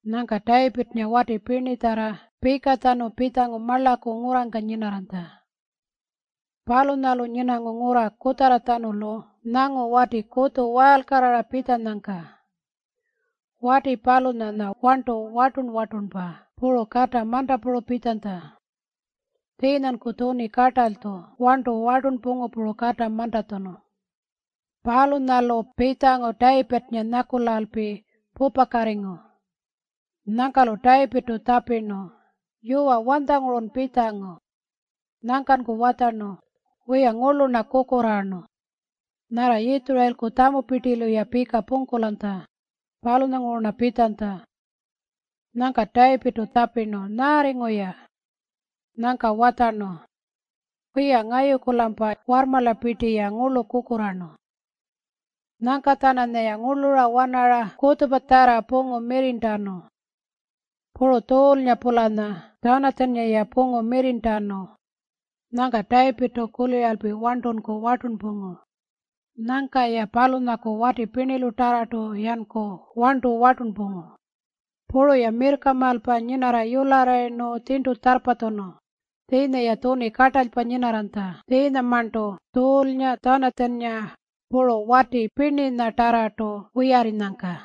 Nyangka Tayipirrnga wati pirnitjarra pikatjanu marlaku pitjangu ngurrangka nyinarranytja. Palunyalu nyinangu ngurra kutjarratjanulu nyangu wati kutju waalkarrara pitjanyangka. Wati palunyanya warntu wartun-wartunpa puru kata mantapuru pitjanytja. Tjiinyanku tjuni kartalytju warntu wartunpungu puru kata mantatjunu. Palunyalu pitjangu Tayipirrnga nyakulalpi pupakatingu. Nyangka-lu Tayipirrtu tjapirnu, “Yuwa, wanytjangurun pitjangu?” Nyangkanku watjarnu, “Wiya, ngurlu-rna kukurraarnu, nyarra Yitjurayilku tjamupirtilu-ya pika pungkulanytja, palunyanguru-rna pitjanytja.” Nyangka Tayipirrtu tjapirnu, “Nyaarringu-ya?” Nyangka watjarnu, “Wiya, ngayuku-lampa warrmarlapirti-ya ngurlu kukurraarnu. Nyangka-tjananyaya ngurlura wanarnu kutjupatjarra pungu mirrirntanu. Puru Tjuulnga-pulanyaya Tjanatjannga pungu mirrirntanu.” Nyangka Tayipirrtu kuliralpi warntunku wartunpungu. Nyangka-ya palunyaku wati pirnilutarrartu-yanku warntu wartunpungu. Puru-ya mirrkamaalpa nyinarra yularrayirnu tjirntu tjarrpatjunu. Tjiinya-ya tjuni kartalypa nyinarranytja tjiinyamarntu Tjuulnga, Tjanatjannga, puru wati pirninyatarrartu wiyarrinyangka.